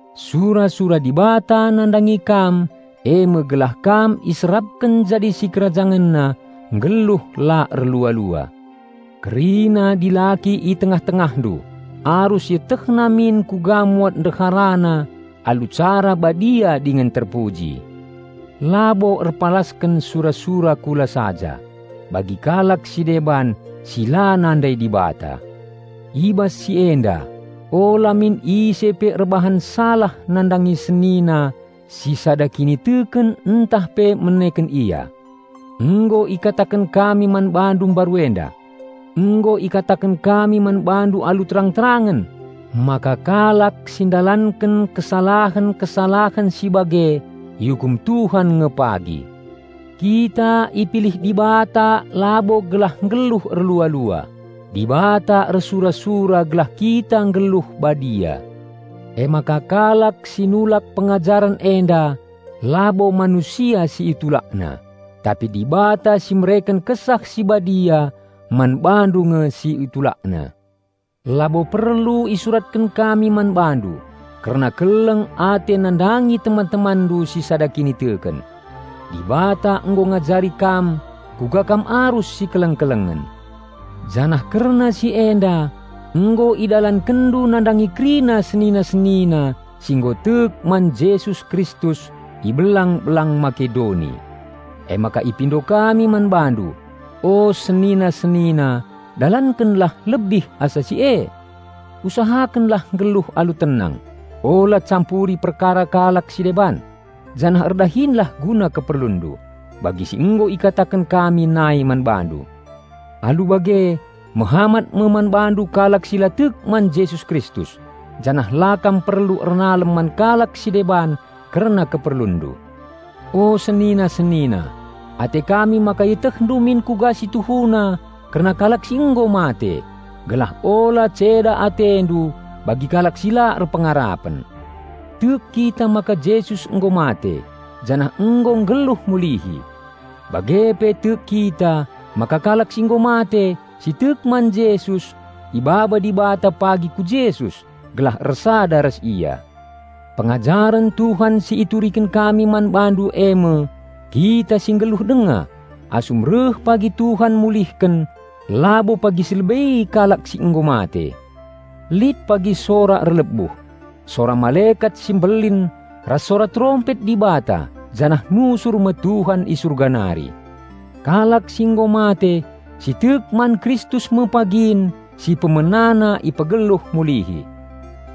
Sura-sura Dibata nandangi kam eme gelah kam iserapken jadi SikerajangenNa nggeluh la erlua-lua. Kerina dilaki i tengah-tengahndu arus ietehna min kuga muat ndeharana alu cara badia dingen terpuji, labo erpalasken sura-sura kula saja, bagi kalak si deban si la nandai Dibata. I bas si enda, ula min ise pe erbahan salah nandangi senina si sada kiniteken ntah pe meneken ia. Nggo ikataken kami man bandu mbaru enda. Nggo ikataken kami man bandu alu terang-terangen maka kalak si ndalanken kesalahen-kesalahen si bage iukum Tuhan nge pagi. Kita ipilih Dibata labo gelah nggeluh erlua-lua. Dibata ersura-sura gelah kita nggeluh badia. Emaka kalak si nulak pengajaren enda labo manusia si itulakna, tapi Dibata si mereken Kesah Si Badia man bandu nge si itulakna. Labo perlu isuratken kami man bandu kerna keleng ate nandangi teman-temanndu si sada kiniteken. Dibata nggo ngajari kam kuga kam arus sikeleng-kelengen. Janah kerna si enda nggo idalankenndu nandangi kerina senina-senina si nggo tek man Jesus Kristus i belang-belang Makedoni. Emaka ipindo kami man bandu, o senina-senina dalankenlah lebih asa si e! Usahakenlah nggeluh alu tenang, ula campuri perkara kalak si deban, janah erdahinlah guna keperlunndu, bagi si nggo ikataken kami nai man bandu. Alu bage, mehamat me man bandu kalak si la tek man Jesus Kristus, janah la kam perlu ernalem man kalak si deban kerna keperlunndu. O senina-senina, ate kami maka ietehndu min kuga si tuhuna kerna kalak si nggo mate, gelah ula ceda atendu bagi kalak si la erpengarapen. Tek kita maka Jesus nggo mate janah nggo nggeluh mulihi. Bage pe tek kita maka kalak si nggo mate si tek man Jesus ibaba Dibata pagi ku Jesus gelah ersada ras Ia. Pengajaren Tuhan si ituriken kami man bandu e me: Kita si nggeluh denga asum reh pagi Tuhan mulihken labo pagi silebei kalak si nggo mate. Lit pagi sora erlebuh, sora malekat si mbelin ras sora terompet Dibata janah nusur me Tuhan i Surga nari. Kalak si nggo mate si tek man Kristus me pagin si pemenana ipegeluh mulihi.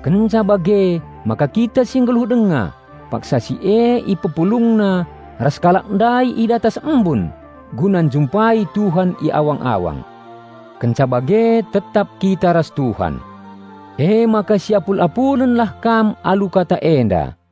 Kenca bage maka kita si nggeluh denga paksa si e IpepulungNa ras kalak ndai i datas embun guna njumpai Tuhan i awang-awang. Kenca bage tetap kita ras Tuhan. Emaka si apul-apulenlah kam alu kata enda.